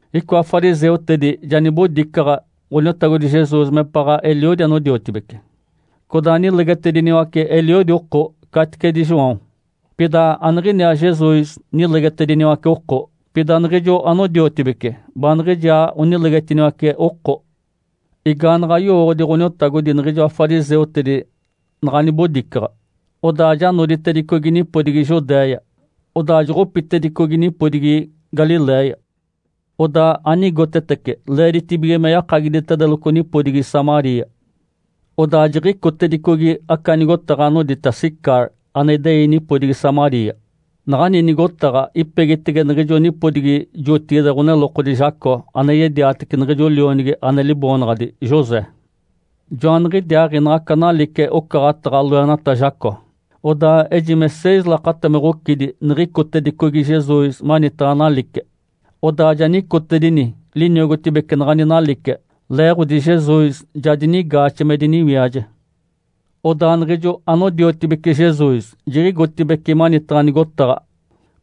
Icoa fariseutedi ja nibodicaɡ̶a Ǥoniotagodi Jesus mepaɡ̶a eliodi anodiotibece, codaa nilegetediniwace eliodi oko caticedi João. (Pida aniɡ̶iniaa Jesus nilegetediniwace oko, pida niɡ̶ijo anodiotibece baaniɡ̶ijaa onilegetiniwace oko.) Igaanaɡ̶a yowooɡ̶odi Ǥoniotagodi niɡ̶ijoa fariseutedi naɡ̶a nibodicaɡ̶a, odaa ja noditedicogi nipodigi Judéia, odaa joɡ̶opitedicogi nipodigi Galiléia. Odaa anigotetece leeditibige me yakagiditedeloco nipodigi Samaria. Odaa jiɡ̶icotedicogi aca nigotaɡ̶a anodita Sicar, ane idei nipodigi Samaria. Naɡ̶ani nigotaɡ̶a ipegitege niɡ̶ijo nipodigi jotigide ɡ̶onelokodi Jacó ane yediatece niɡ̶ijo lionigi ane liboonaɡ̶adi José. Joaniɡ̶idiaaɡ̶i naɡ̶aca nalice ocaɡ̶ataɡ̶a loenata Jacó. Odaa ejime seis lakata me ɡ̶ocidi niɡ̶icotedicogi Jesus manitaɡ̶a nalice, odaa ja nicotedini liniogotibece naɡ̶ani nalice, leeɡ̶odi Jesus ja dinigaaxe me diniwiaje. Odaa niɡ̶ijo anodiotibece Jesus jiɡ̶igotibeci manitaɡ̶a nigotaɡ̶a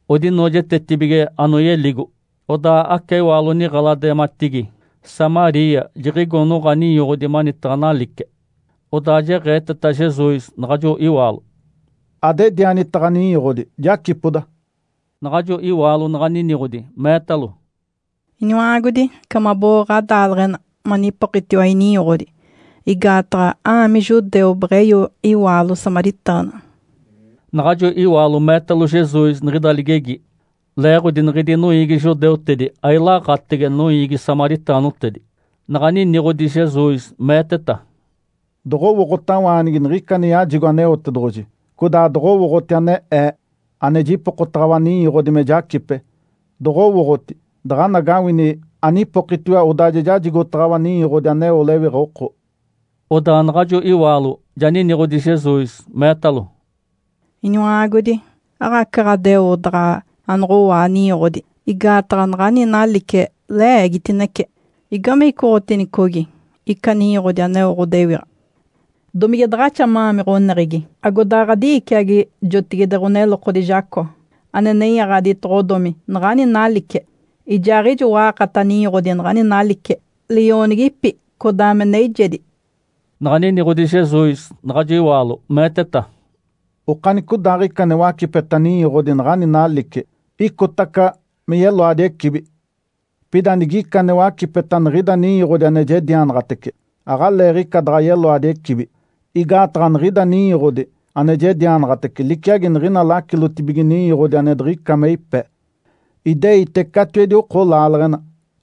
odinoojetetibige anoyeligo. Odaa aca iwaalo niɡ̶eladimatigi Samaria jiɡ̶igo noɡ̶a ninyoɡ̶odi manitaɡ̶a nalice. Odaa jeɡ̶eeteta Jesus naɡ̶ajo iwaalo, “Adedianita ɡ̶aninyoɡ̶odi, jacipoda”. Naɡ̶ajo iwaalo naɡ̶a niniɡ̶odi, meetalo, “Iniwa-aagodi. Ica mabo-oo ɡ̶adaaleɡ̶ena manipokitiwa ininyoɡ̶odi, igaataɡ̶a a-aami judeu, beɡ̶eyo iwaalo samaritaana?” Naɡ̶ajo iwaalo meetalo Jesus niɡ̶ida ligegi, leeɡ̶odi niɡ̶idi noiigi judeutedi ailaaɡ̶atege noiigi samaritaanotedi. Naɡ̶a niniɡ̶odi Jesus meeteta, “Doɡ̶owooɡ̶otawaanigi niɡ̶ica ane yajigo Aneotedoɡ̶oji, codaa doɡ̶owooɡ̶oti ane Ee, ane jipokotaɡ̶awa ninyoɡ̶odi me jacipe. Doɡ̶owooɡ̶oti, daɡ̶anagawini anipokitiwa odaa ja jajigotaɡ̶awa ninyoɡ̶odi aneo lewiɡ̶a oko”. Odaa naɡ̶ajo iwaalo ja niniɡ̶odi Jesus, meetalo, “Iniwa-aagodi, aɡ̶aca ɡ̶adeo daɡ̶a anoɡ̶owaa ninyoɡ̶odi, igaataɡ̶a naɡ̶ani nalice le-eegitinece. Igame icoɡ̶oteeniticogi ica ninyoɡ̶odi aneo ɡ̶odewiɡ̶a? Domige daɡ̶axa ma-aami ɡ̶oneɡ̶egi, agodaɡ̶a ɡ̶adi-iiciagi jotigide ɡ̶onelokodi Jacó, ane nenyaɡ̶aditoɡ̶odomi naɡ̶ani nalice? Ijaaɡ̶ijo wa-aakata ninyoɡ̶odi naɡ̶ani nalice, li-oonigipi, codaa me neijedi”. Naɡ̶a niniɡ̶odi Jesus naɡ̶ajo iwaalo, meeteta, “Okanicodaaɡ̶ica ane wacipeta ninyoɡ̶odi naɡ̶ani nalice, icotaca me yeloadi ecibi. Pida nigica ane wacipeta niɡ̶ida ninyoɡ̶odi ane jedianaɡ̶atece, aɡ̶aleeɡ̶ica daɡ̶a yeloadi ecibi. Igaataɡ̶a niɡ̶ida ninyoɡ̶odi ane jedianaɡ̶atece liciagi niɡ̶ina lacilotibige ninyoɡ̶odi ane diɡ̶ica me ipe, ideite catiwedi oko laaleɡ̶ena,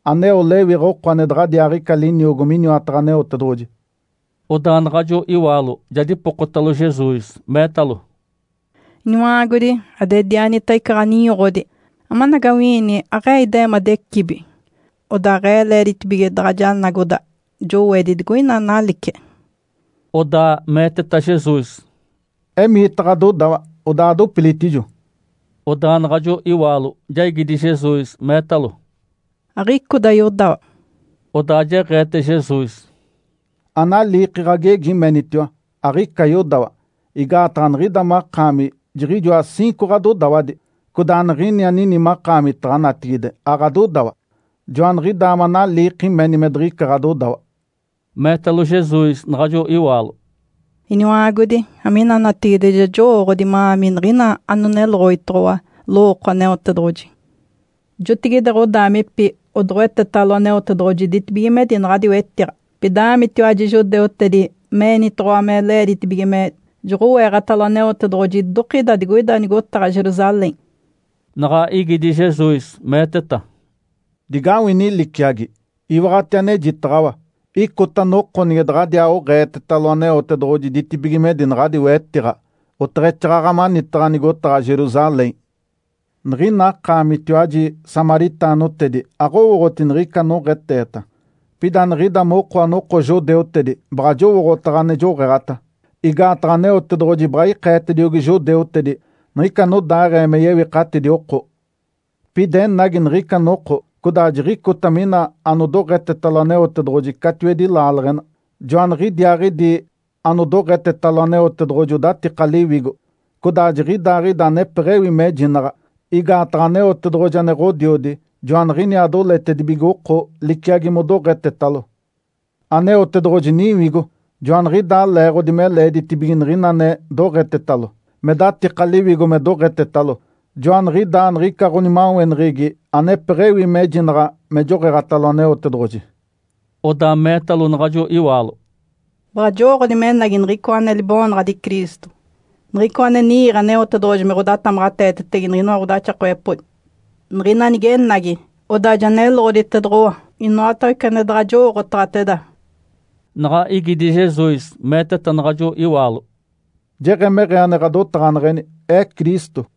aneo lewiɡ̶a oko ane daɡ̶adiaaɡ̶ica liniogo miniwataɡ̶a Aneotedoɡ̶oji”. Odaa naɡ̶ajo iwaalo ja dipokotalo Jesus, meetalo, “Iniwa-aagodi, adedianita ica ninyoɡ̶odi, amanagawi-iini aɡ̶e-ee ide-eemadi ecibi, odaa aɡ̶e-ee le-eeditibige daɡ̶a janagoda jowedi digoina nalice”. Odaa meeteta Jesus, “Emiita ɡ̶adodawa, odaa adopilitijo”. Odaa naɡ̶ajo iwaalo ja igidi Jesus, meetalo, “Aɡ̶icoda yodawa”. Odaa jeɡ̶eete Jesus, “Analiiki ɡ̶agegi menitiwa, ‘Aɡ̶ica yodawa’. Igaataɡ̶a niɡ̶ida makaami jiɡ̶ijoa ciinco ɡ̶adodawadi, codaa niɡ̶ini anini makaamitaɡ̶a natigide aɡ̶adodawa. Joaniɡ̶idaa manaliiki meni me diɡ̶ica ɡ̶adodawa”. Meetalo Jesus naɡ̶ajo iwaalo, “Iniwa-aagodi. Amina natigide ja jowooɡ̶odi ma-aami niɡ̶ina anoneloɡ̶oditoɡ̶owa lowooko Aneotedoɡ̶oji. Jotigide ɡ̶odaamipi odoɡ̶owetetalo Aneotedoɡ̶oji ditibigimedi naɡ̶adi wetiɡ̶a. Pida a-aamitiwaji judeutedi me-eenitoɡ̶owa me le-eeditibige me joɡ̶oweɡ̶atalo Aneotedoɡ̶oji idokida digoida nigotaɡ̶a Jerusalém”. Naɡ̶a igidi Jesus, meeteta, “Digawini liciagi. Iwaɡ̶ati anejitaɡ̶awa. Icota noko nige daɡ̶adiaa oɡ̶eetetalo Aneotedoɡ̶oji ditibigimedi naɡ̶adi wetiɡ̶a, oteɡ̶exaaɡ̶aɡ̶a manitaɡ̶a nigotaɡ̶a Jerusalém. Niɡ̶ina akaamitiwaji samaritaanotedi aɡ̶owooɡ̶oti niɡ̶ica anoɡ̶eeteta. Pida niɡ̶ida moko anoko judeutedi baɡ̶a jowooɡ̶otaɡ̶a ane joɡ̶eeɡ̶ata. Igaataɡ̶a Aneotedoɡ̶oji baɡ̶a ikeetediogi judeutedi niɡ̶ica anodaaɡ̶ee me yewikatidi oko. Pida enagi niɡ̶ica noko codaa jiɡ̶icota mina anodoɡ̶etetalo Aneotedoɡ̶oji catiwedi laaleɡ̶ena, joaniɡ̶idiaaɡ̶idi anodoɡ̶etetalo Aneotedoɡ̶oji odatika liwigo, codaa jiɡ̶idaaɡ̶ida anepeɡ̶ewi mejinaɡ̶a. Igaataɡ̶a Aneotedoɡ̶oji ane Ǥodiodi joaniɡ̶inaa doletedibige oko liciagi modoɡ̶etetalo. Aneotedoɡ̶oji Niwigo. Joaniɡ̶idaa leeɡ̶odi me leeditibige niɡ̶ina ane doɡ̶etetalo, me datika liwigo me doɡ̶etetalo, joaniɡ̶idaa niɡ̶ica ɡ̶onimaweneɡ̶egi anepeɡ̶ewi mejinaɡ̶a me joɡ̶eeɡ̶atalo Aneotedoɡ̶oji”. Odaa meetalo naɡ̶ajo iwaalo, “Baɡ̶a jowooɡ̶odi menagi Niɡ̶icoa ane libo-oonaɡ̶adi Cristo, Niɡ̶icoa ane ni-iiɡ̶e Aneotedoɡ̶oji me ɡ̶odatamaɡ̶ateetetege niɡ̶inoa ɡ̶odaxakawepodi. Niɡ̶ina nigenagi, odaa ja neloɡ̶oditedoɡ̶owa inoatawece ane daɡ̶a jowooɡ̶otaɡ̶ateda.” Naɡ̶a igidi Jesus, meeteta naɡ̶ajo iwaalo, “Jeɡ̶emeɡ̶ee ane ɡ̶adotaɡ̶aneɡ̶eni, Ee Cristo”.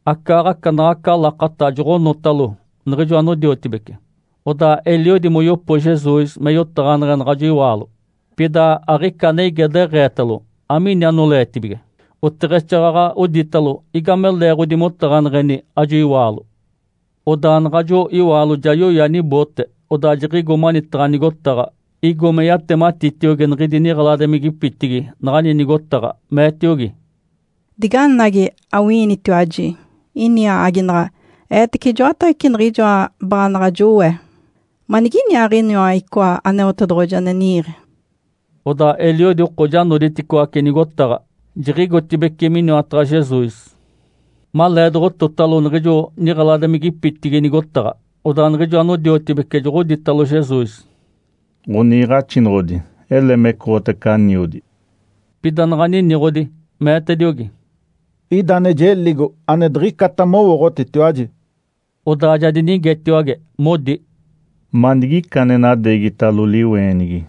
Acaaɡ̶aca naɡ̶aca lakata joɡ̶onotalo niɡ̶ijo anodiotibece. Odaa eliodi moyopo Jesus me yotaɡ̶aneɡ̶e naɡ̶ajo iwaalo. Pida aɡ̶ica ane ige, deɡ̶eetalo, “Amiini anoleetibige?” Oteɡ̶exaaɡ̶aɡ̶a oditalo, “Igame leeɡ̶odi motaɡ̶aneɡ̶eni ajo iwaalo?” Odaa naɡ̶ajo iwaalo ja yoya niboote. Odaa jiɡ̶igo manitaɡ̶a nigotaɡ̶a, igo me yatematitiogi niɡ̶idi niɡ̶eladimigipitigi naɡ̶ani nigotaɡ̶a, meetiogi, “Diganagi, awi-iinitiwaji ini aaginaɡ̶a eetece ijoatawece niɡ̶ijoa baanaɡ̶a jowee! Maniginiaaɡ̶iniwa icoa Aneotedoɡ̶oji ane ni-iiɡ̶e?” Odaa eliodi oko ja noditicoaci nigotaɡ̶a, jiɡ̶igotibeci miniwataɡ̶a Jesus. Maleedoɡ̶ototalo niɡ̶ijo niɡ̶eladimigipitigi nigotaɡ̶a, odaa niɡ̶ijo anodiotibece joɡ̶oditalo Jesus, “Ǥoniiɡ̶axinoɡ̶odi, ele mecoɡ̶otace aniodi”. Pida naɡ̶a niniɡ̶odi, meetediogi, “Ida ane jeligo, ane diɡ̶icata mowooɡ̶otitiwaji”. Odaa ja dinigetiwage, modi, “Manigicaa ane nadeegitalo liweenigi?”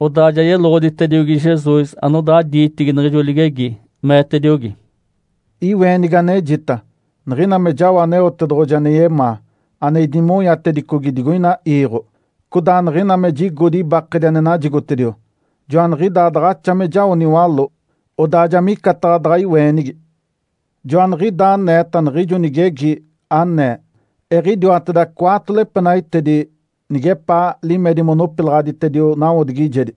Odaa ja yeloɡ̶oditediogi Jesus anodaa diitigi niɡ̶ijo ligegi, meetediogi, “Iweenigi anejita, niɡ̶ina me jao Aneotedoɡ̶oji ane yemaa, ane idimonyatedicogi digoina iiɡ̶o, codaa niɡ̶ina me jigodi ibakedi ane najigotediwa. (Joaniɡ̶idaa daɡ̶axa me jao niwaló odaa ja micataɡ̶a daɡ̶a iweenigi). Joaniɡ̶idaa aneeta niɡ̶ijo nigegi, anee, ‘Eɡ̶idiwateda cwaatolo epenaitedi nigepaa limedi monopilaɡ̶aditedio nawodigijedi’.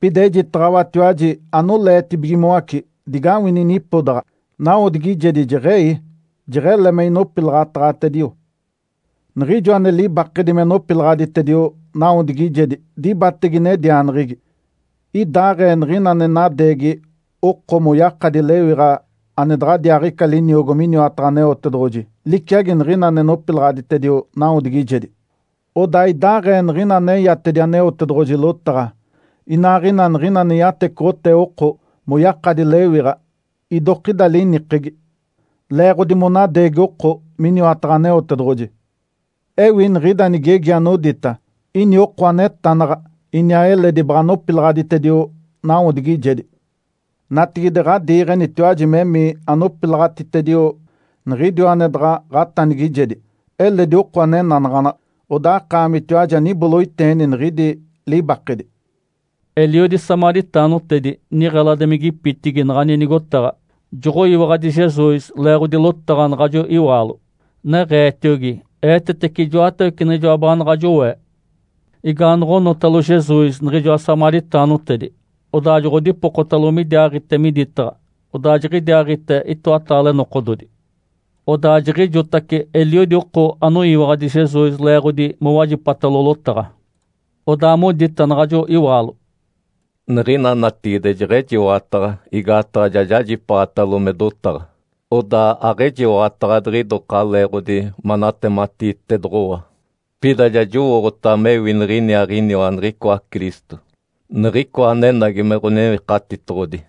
Pida ejitaɡ̶awatiwaji anoleetibigimoace digawini nipodaɡ̶a, nawodigijedi jeɡ̶ei, jeɡ̶ele me inopilaɡ̶ataɡ̶atedio. Niɡ̶ijo ane libakedi me nopilaɡ̶aditedio nawodigijedi dibatege nedianeɡ̶egi. Idaaɡ̶ee niɡ̶ina ane nadeegi oko moyakadi lewiɡ̶a ane daɡ̶adiaaɡ̶ica liniogo miniwataɡ̶a Aneotedoɡ̶oji liciagi niɡ̶ina ane nopilaɡ̶aditedio nawodigijedi. Odaa idaaɡ̶ee niɡ̶ina aneyatedi Aneotedoɡ̶oji lotaɡ̶a, inaaɡ̶ina niɡ̶ina ane yatecoɡ̶otee oko moyakadi lewiɡ̶a idokida linikegi. (Leeɡ̶odi monadeegi oko miniwataɡ̶a Aneotedoɡ̶oji). Ewi niɡ̶ida nigegi anodita, ‘Ini oko anetanaɡ̶a, iniaa eledi baɡ̶a nopilaɡ̶aditedio nawodigijedi.’ Natigide ɡ̶adiiɡ̶enitiwaji memii anopilaɡ̶aditedio niɡ̶idiwa ane daɡ̶a ɡ̶atanigijegi. Eledi oko ane enanaɡ̶anaɡ̶a, odaa akaamitiwaji aniboloiteeni niɡ̶idi libakedi”. Eliodi samaritaanotedi niɡ̶eladimigipitigi naɡ̶ani nigotaɡ̶a joɡ̶oyiwaɡ̶adi Jesus leeɡ̶odi lotaɡ̶a naɡ̶ajo iwaalo, neɡ̶eetiogi, “Eetetece ijoatawece niɡ̶ijoa baanaɡ̶a jowee”. Igaanaɡ̶a onotalo Jesus niɡ̶ijoa samaritaanotedi, odaa joɡ̶odipokotalo midiaaɡ̶ite miditaɡ̶a. Odaa jiɡ̶idiaaɡ̶ite itoataale nokododi. Odaa jiɡ̶ijotace eliodi oko anoyiwaɡ̶adi Jesus leeɡ̶odi mowajipatalo lotaɡ̶a. Odaa modita naɡ̶ajo iwaalo, “Niɡ̶ina natigide jeɡ̶ejiwaɡ̶ataɡ̶a igaataɡ̶a ja jajipaaɡ̶atalo me dotaɡ̶a, odaa aɡ̶ejiwaɡ̶ataɡ̶a diɡ̶idoka leeɡ̶odi manatematiitedoɡ̶owa. Pida ja jowooɡ̶otaɡ̶a mewi niɡ̶iniaaɡ̶iniwa niɡ̶icoa Cristo, Niɡ̶icoa anenagi me Ǥonewikatitoɡ̶odi”.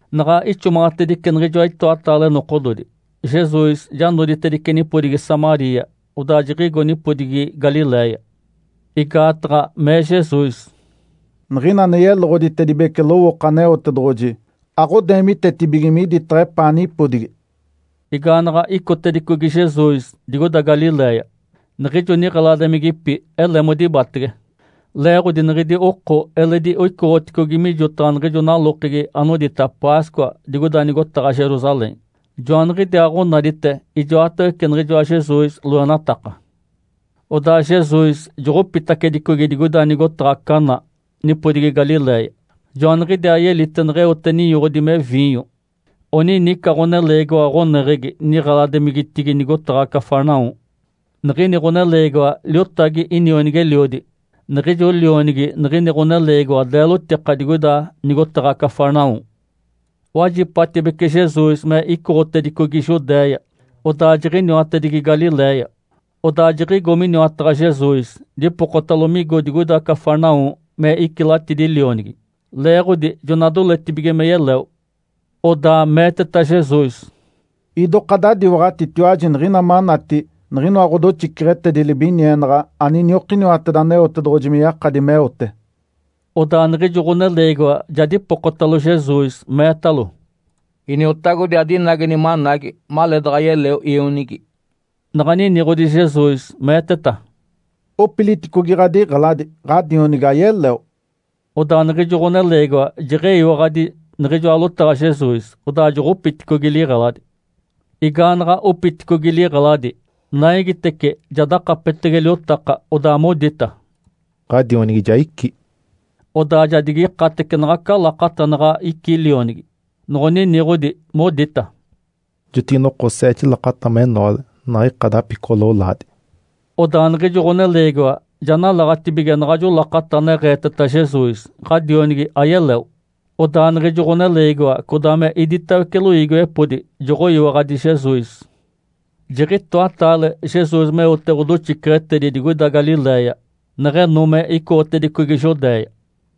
Naɡ̶a ixomaɡ̶atedice niɡ̶ijoa itoataale nokododi, Jesus ja noditedice nipodigi Samaria, odaa jiɡ̶igo nipodigi Galiléia. Igaataɡ̶a mee Jesus, “Niɡ̶ina ane yeloɡ̶oditedibece lowooko Aneotedoɡ̶oji aɡ̶odeemitetibige miditaɡ̶a epaa nipodigi”. Igaanaɡ̶a icotedicogi Jesus digoida Galiléia, niɡ̶ijo niɡ̶eladimigipi ele modibatege. Leeɡ̶odi niɡ̶idi oko eledi oicoɡ̶oticogi mijotaɡ̶a niɡ̶ijo nalokegi anodita Páscoa digoida nigotaɡ̶a Jerusalém, joaniɡ̶idiaaɡ̶onadite ijoatawece niɡ̶ijoa Jesus loenataka. Odaa Jesus joɡ̶opitacedicogi digoida nigotaɡ̶a Caná nipodigi Galiléia. Joaniɡ̶idiaa yelite neɡ̶eote ninyoɡ̶odi me viinyo. Oninica ɡ̶oneleegiwa ɡ̶oneɡ̶egi niɡ̶eladimigitigi nigotaɡ̶a Cafarnaum. Niɡ̶ini ɡ̶oneleegiwa liotagi inionigi-eliodi. Niɡ̶ijo lionigi niɡ̶ini ɡ̶oneleegiwa deelotika digoida nigotaɡ̶a Cafarnaum. Wajipatibece Jesus me icoɡ̶otedicogi Judéia, odaa jiɡ̶iniwatedigi Galiléia. Odaa jiɡ̶igo miniwataɡ̶a Jesus, dipokotalo migo digoida Cafarnaum me icilatidi lionigi, leeɡ̶odi jona doletibige me yeleo. Odaa meeteta Jesus, “Idoka adadiwaɡ̶atitiwaji niɡ̶ina manati niɡ̶inoa ɡ̶odoxiceɡ̶etedi libinienaɡ̶a aniniokiniwateda Aneotedoɡ̶oji me yakadi meote”. Odaa niɡ̶ijo ɡ̶oneleegiwa ja dipokotacalo Jesus, meetalo, “Iniotagodi. Adinageni managi maleedaɡ̶a yeleo ionigi”. Naɡ̶a niniɡ̶odi Jesus, meeteta, “Opiliticogi ɡ̶adiɡ̶eladi. Ǥadionigi ayeleo.” Odaa niɡ̶ijo ɡ̶oneleegiwa jeɡ̶eyiwaɡ̶adi niɡ̶ijoa lotaɡ̶a Jesus, odaa joɡ̶opiticogi liɡ̶eladi. Igaanaɡ̶a opiticogi liɡ̶eladi, naigitece ja dakapetege liotaka. Odaa modita, “Ǥadionigi ja icí.” Odaa ja digikatece naɡ̶aca lakata naɡ̶a icí lionigi. Noɡ̶oniniɡ̶odi, modita, “Jotigi-noko, seete lakata menoale naɡ̶a ika dapicoɡ̶o-lolaadi”. Odaa niɡ̶ijo ɡ̶oneleegiwa ja nalaɡ̶atibige naɡ̶ajo lakata neɡ̶eeteta Jesus, “Ǥadionigi ayeleo.” Odaa niɡ̶ijo ɡ̶oneleegiwa codaa me iditawece loiigiwepodi joɡ̶oyiwaɡ̶adi Jesus. Jiɡ̶itoataale Jesus meote ɡ̶odoxiceɡ̶etedi digoida Galiléia, neɡ̶eno me icoɡ̶otedicogi Judéia.